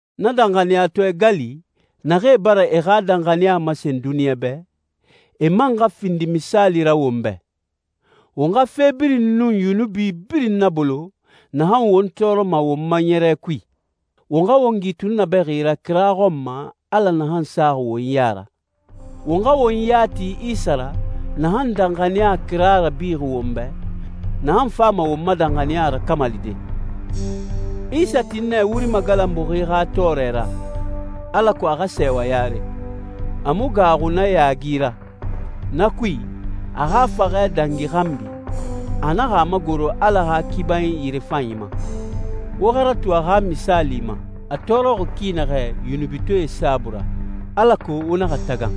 Na danxaniyatɔɛ gali, naxee bara e xa danxaniya masen duniɲa bɛ, e man xa findi misaali ra won bɛ. Won xa fe birin nun yunubi birin nabolo naxan won tɔɔrɔma won ma ɲɛrɛ kui. Won xa won gi tunnabɛxi ra kira xɔn ma Ala naxan saxi won ya ra. Won xa won ya ti Isa ra, naxan danxaniya kira rabixi won bɛ, naxan fama won ma danxaniya rakamalide. Isa tin nɛ wuri magalanbuxi xa tɔɔrɛ ra, alako a xa sɛɛwa yare. A mu gaaxu na yaagi ra. Na kui, a xa faxɛ dangi xanbi, a naxa a magoro Ala xa kibanyi yirefanyi ma. Wo xa ratu a xa misaali ma, a tɔɔrɔxi ki naxɛ yunubitɔɛe saabui ra, alako wo naxa tagan,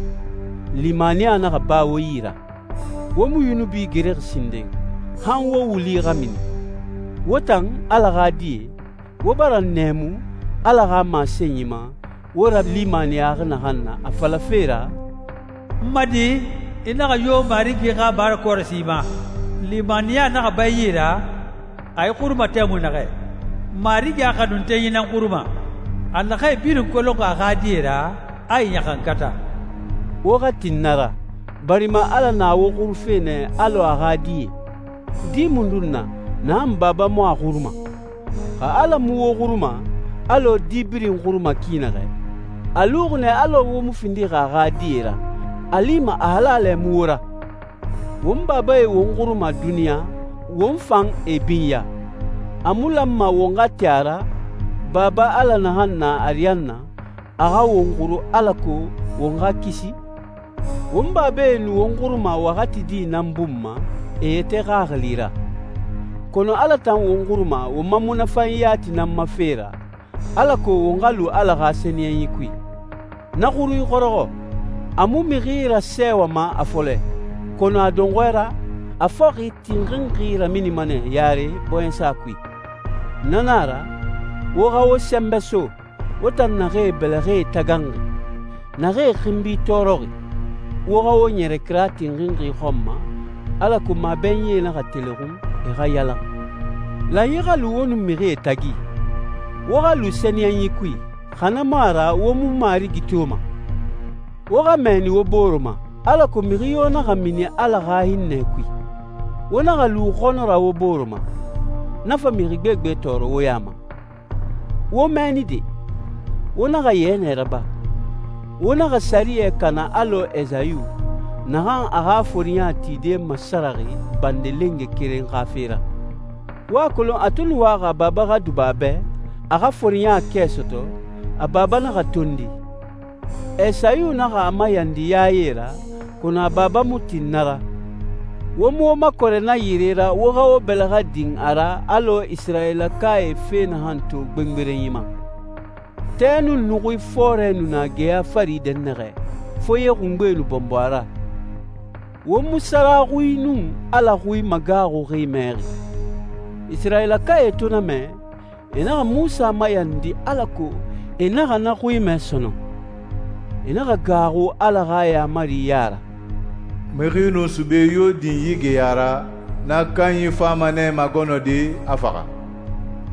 limaniya naxa ba wo yi ra. Wo mu yunubi gerexi sinden, han wo wuli xa mini. Wo tan, Ala xa die, wo bara nɛɛmu Ala xa masenyi ma wo ralimaniyaxi naxan na, a falafe ra, «N ma di, i naxa yo Marigi xa marakɔrɔsi ma, limaniya naxa ba i yi ra, a i xuruma tɛmui naxɛ. Marigi a xanuntenyi nan xuruma. A naxee birin kolonxi a xa die ra, a e ɲaxankata.» Wo xa tin na ra, barima Ala na wo xurufe nɛ alɔ a xa die. Di mundun na, naxan baba mu a xuruma? Xa Ala mu wo xuruma, alɔ di birin xuruma ki naxɛ, a luxi nɛ alɔ wo mu findixi a xa die ra, a lima a halalɛ mu wo ra. Won babae won xuruma duniɲa, won fan e binya. A mu lanma won xa tin a ra, Baba Ala naxan na ariyanna, a xa won xuru alako won xa kisi? Won babae nu won xuruma waxati di nan bun ma e yɛtɛ xaxili ra, kɔnɔ Ala tan won xuruma won ma munafanyi yati nan ma fe ra, alako won xa lu Ala xa sɛniyɛnyi kui. Na xurui xɔrɔxɔ, a mu mixi rasɛɛwama a fɔlɛ, kɔnɔ a dɔnxɔɛ ra, a fɔxi tinxinxi raminima nɛ yare bɔɲɛsa kui. Na na a ra, wo xa wo sɛnbɛ so, wo tan naxee bɛlɛxɛe taganxi, naxee xinbi tɔɔrɔxi. Wo xa wo ɲɛrɛ kira tinxinxi xɔn ma, alako mabɛnyie naxa telexun, e xa yalan. Lanyi xa lu wo nun mixie tagi. Wo xa lu sɛniyɛnyi kui, xa na mu a ra wo mu Marigi toma. Wo xa mɛɛni wo bore ma, alako mixi yo naxa mini Ala xa hinnɛ kui. Wo naxa lu xɔnɔ ra wo bore ma, na fa mixi gbegbe tɔɔrɔ wo ya ma. Wo mɛɛni de! Wo naxa yɛnɛ raba. Wo naxa sɛriyɛ kana alɔ Esayu, naxan a xa foriɲa tide masaraxi bande lenge keren xa fe ra. Wo a kolon a to nu waxi a baba xa duba a bɛ, a xa foriɲa kɛ sɔtɔ, a baba naxa tondi. Esayu naxa a mayandi yaye ra, kɔnɔ a baba mu tin na ra. Wo mu wo makɔrɛ na yire ra wo xa wo bɛlɛxɛ din a ra alɔ Isirayilakae fe naxan to gbengberenyi ma. Tɛ nun nuxui fɔɔrɛ nu na geya fari dɛnnaxɛ, foye xungbe nu bɔnbɔ a ra. Wo mu sara xui nun Ala xui magaaxui mɛxi. Isirayilakae to na mɛ, e naxa Munsa mayandi alako e naxa na xui mɛ sɔnɔn. E naxa gaaxu Ala xa yaamari ya ra, «Mixi nun sube yo din yi geya ra, na kanyi fama nɛ magɔnɔde, a faxa.»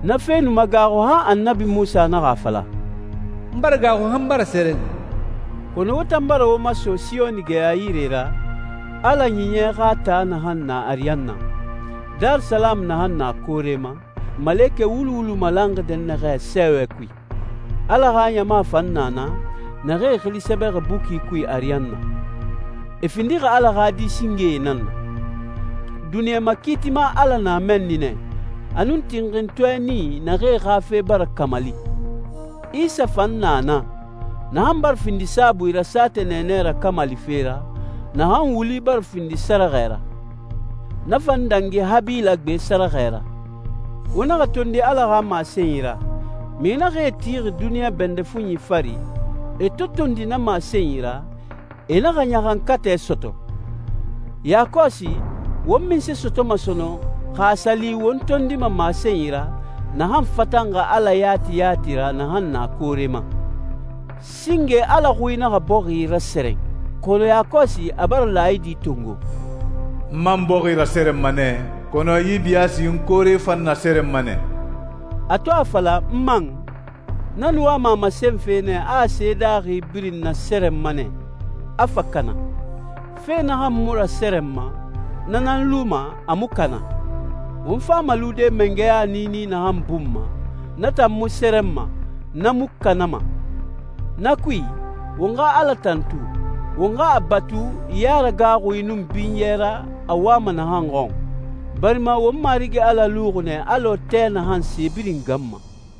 Na fe nu magaaxu han Annabi Munsa naxa a fala, «N bara gaaxu han n bara sɛrɛn.» Kɔnɔ wo tan bara wo maso Siyoni geya yire ra, Ala Ɲiɲɛ xa taa naxan na ariyanna, Darisalamu naxan na koore ma, malekɛ wulu wulu malanxi dɛnnaxɛ sɛɛwɛ kui. Ala xa ɲama fan na na, naxee xili sɛbɛxi buki kui ariyanna. E findixi Ala xa di singee nan na. Duniɲa Makiitima Ala na mɛnni nɛ, a nun tinxintɔɛ nii naxee xa fe bara kamali. Isa fan na naa, naxan bara findi saabui ra saatɛ nɛɛnɛ rakamalife ra, naxan wuli bara findi sɛrɛxɛ ra. Na fan dangi Habila gbe sɛrɛxɛ ra. Wo naxa tondi Ala xa masenyi ra. Mixi naxee tixi duniɲa bɛndɛ fuɲi fari, e to tondi na masenyi ra, e naxa ɲaxankatɛ sɔtɔ. Yakɔsi, won munse sɔtɔma sɔnɔn xa a sa li won tondima masenyi ra, naxan fatanxi Ala yati yati ra naxan na koore ma? Singe Ala xui naxa bɔxi rasɛrɛn, kɔnɔ yakɔsi a bara laayidi tongo, «N man bɔxi rasɛrɛnma nɛ, kɔnɔ yi biyaasi n koore fan nasɛrɛnma nɛ.» A to a fala, «n man,» na nu wama a masenfe nɛ a se daaxi birin nasɛrɛnma nɛ, a fa kana. Fe naxan mu rasɛrɛnma, na nan luma, a mu kana. Won fama lude mangɛya niini naxan bun ma, na tan mu sɛrɛnma, na mu kanama. Na kui, won xa Ala tantu, won xa a batu yaragaaxui nun binyɛ ra a wama naxan xɔn, barima won Marigi Ala luxi nɛ alɔ tɛ naxan se birin ganma.